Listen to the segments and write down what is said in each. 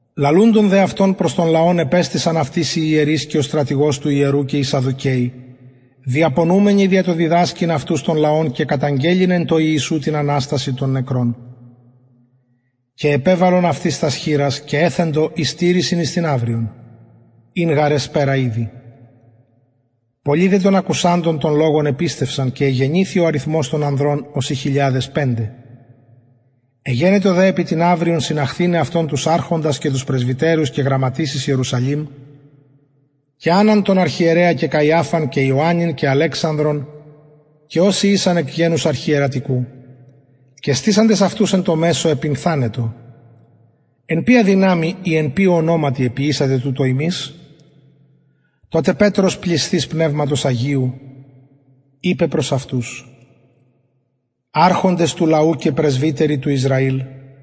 λαλουντων δε αυτων προς τον λαον επεστησαν αυτοις οι ιερεις και ο στρατηγος του ιερου και οι σαδδουκαιοι διαπονουμενοι δια το διδασκειν αυτους τον λαον και καταγγελλειν εν τω ιησου την αναστασιν των νεκρων και επεβαλον αυτοις τας χειρας και εθεντο εις τηρησιν εις την αυριον ην γαρ εσπερα ηδη πολλοι δε των ακουσαντων τον λογον επιστευσαν και εγενηθη ο αριθμος των ανδρων ωσει χιλιαδες πεντε εγενετο δε επι την αυριον συναχθηναι αυτων τους αρχοντας και πρεσβυτερους και γραμματεις εις ιερουσαλημ και ανναν τον αρχιερεα και καιαφαν και ιωαννην και αλεξανδρον και οσοι ησαν εκ γενους αρχιερατικου και στησαντες αυτους εν μεσω επυνθανοντο εν ποια δυναμει η εν ποιω ονοματι εποιησατε τουτο υμεις τοτε πετρος πλησθεις πνευματος αγιου ειπεν προς αυτους αρχοντες του λαου και πρεσβυτεροι του ισραηλ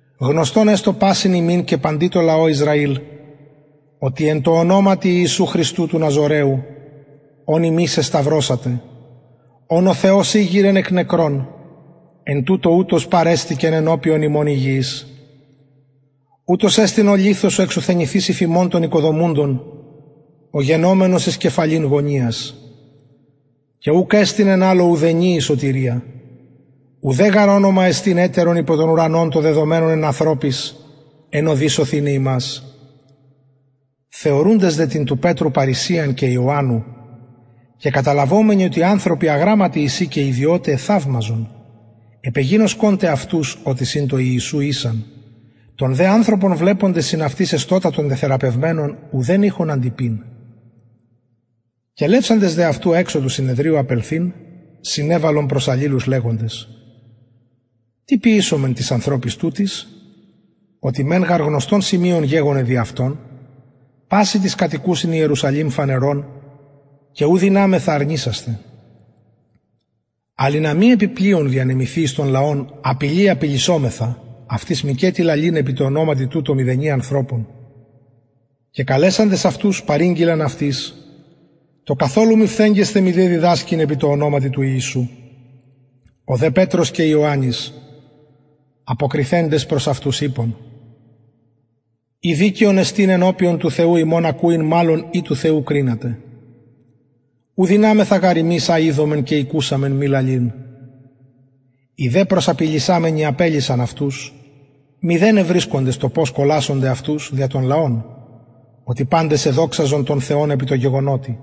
γνωστον εστω πασιν υμιν και παντι τω λαω ισραηλ οτι εν τω ονοματι ιησου χριστου του ναζωραιου ον υμεις εσταυρωσατε ον ο θεος ηγειρεν εκ νεκρων εν τουτω ουτος παρεστηκεν ενωπιον υμων υγιης ουτος εστιν ο λιθος ο εξουθενηθεις υφ υμων των οικοδομουντων ο γενομενος εις κεφαλην γωνιας και ουκ εστιν εν αλλω ουδενι η σωτηρια ουτε γαρ ονομα εστιν ετερον το δεδομενον εν ανθρωποις εν ω δει σωθηναι ημας θεωρουντες δε την του πετρου παρρησιαν και ιωαννου και καταλαβομενοι οτι ανθρωποι αγραμματοι εισιν και ιδιωται εθαυμαζον επεγινωσκον τε αυτους οτι συν τω ιησου ησαν τον δε ανθρωπον βλεποντες συν αυτοις εστωτα τον τεθεραπευμενον ουδεν ειχον αντειπειν κελευσαντες δε αυτους εξω του συνεδριου απελθειν συνεβαλλον προς αλληλους λεγοντες τι ποιησομεν τοις ανθρωποις τουτοις οτι μεν γαρ γνωστον σημειον γεγονεν δι αυτων πασιν τοις κατοικουσιν ιερουσαλημ φανερον και ου δυναμεθα αρνησασθαι αλλ ινα μη επι πλειον διανεμηθη εις τον λαον απειλη απειλησομεθα αυτοις μηκετι λαλειν επι τω ονοματι τουτω μηδενι ανθρωπων και καλεσαντες αυτους παρηγγειλαν αυτοις το καθολου μη φθεγγεσθαι μηδε διδασκειν επι τω ονοματι του ιησου ο δε πετρος και ιωαννης αποκριθεντες προς αυτους ειπον ει δικαιον εστιν ενωπιον του θεου υμων ακουειν μαλλον η του θεου κρινατε ου δυναμεθα γαρ ημεις α ειδομεν και ηκουσαμεν μη λαλειν οι δε προσαπειλησαμενοι απελυσαν αυτους μηδεν ευρισκοντες το πως κολασονται αυτους δια τον λαον οτι παντες εδοξαζον τον θεον επι τω γεγονοτι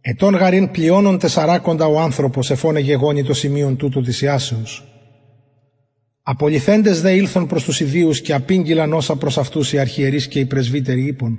ετων γαρ ην πλειονων τεσσαρακοντα ο ανθρωπος εφ ον εγεγονει το σημειον τουτο της ιασεως απολυθεντες δε ηλθον προς τους ιδιους και απηγγειλαν οσα προς αυτους οι αρχιερεις και οι πρεσβυτεροι ειπον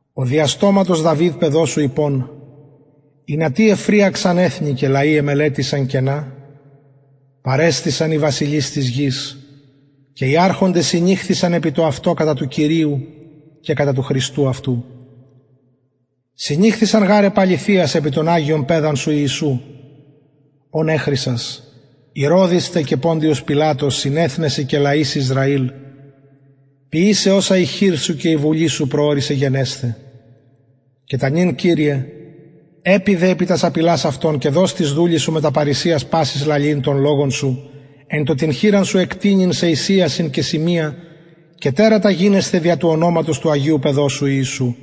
ο δια στοματος δαυιδ παιδος σου ειπων ινα τι εφρυαξαν εθνη και λαοι εμελετησαν κενα παρεστησαν οι βασιλεις της γης και οι αρχοντες συνηχθησαν επι το αυτο κατα του κυριου και κατα του χριστου αυτου συνηχθησαν γαρ επ αληθειας επι τον αγιον παιδα σου ιησουν ον εχρισας ηρωδης τε και ποντιος πιλατος συν εθνεσιν και λαοις ισραηλ ποιησαι οσα η χειρ σου και η βουλη σου προωρισεν γενεσθαι και τα νυν κυριε επιδε επι τας απειλας αυτων και δος τοις δουλοις σου μετα παρρησιας πασης λαλειν τον λογον σου εν τω την χειρα σου εκτεινειν σε εις ιασιν και σημεια και τερατα γινεσθαι δια του ονοματος του αγιου παιδος σου ιησου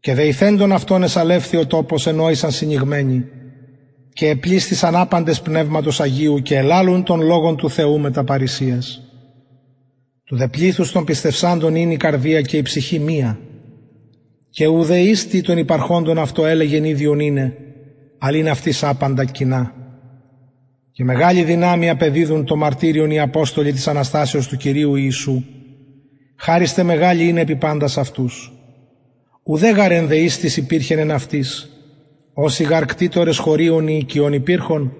και δεηθεντων αυτων εσαλευθη ο τοπος εν ω ησαν συνηγμενοι και επλησθησαν απαντες πνευματος αγιου και ελαλουν τον λογον του θεου μετα παρρησιας του δε πληθους των πιστευσαντων ην η καρδια και η ψυχη μια και ουδε εις τι των υπαρχοντων αυτων ελεγεν ιδιον ειναι αλλ ην αυτοις απαντα κοινα και μεγαλη δυναμει απεδιδουν το μαρτυριον οι αποστολοι της αναστασεως του κυριου ιησου χαρις τε μεγαλη ην επι παντας αυτους ουδε γαρ ενδεης τις υπηρχεν εν αυτοις οσοι γαρ κτητορες χωριων η οικιων υπηρχον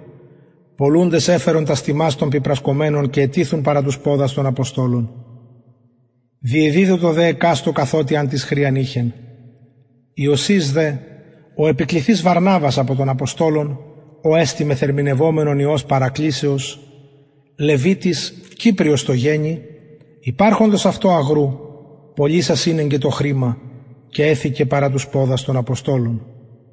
πωλουντες εφερον τας τιμας των πιπρασκομενων και ετιθουν παρα τους ποδας των αποστολων διεδιδοτο δε εκαστω καθοτι αν τις χρειαν ειχεν ιωσης δε ο επικληθεις βαρναβας απο των αποστολων ο εστιν μεθερμηνευομενον υιος παρακλησεως λευιτης κυπριος τω γενει υπαρχοντος αυτω αγρου πωλησας ηνεγκεν το χρημα και εθηκεν παρα τους ποδας των αποστολων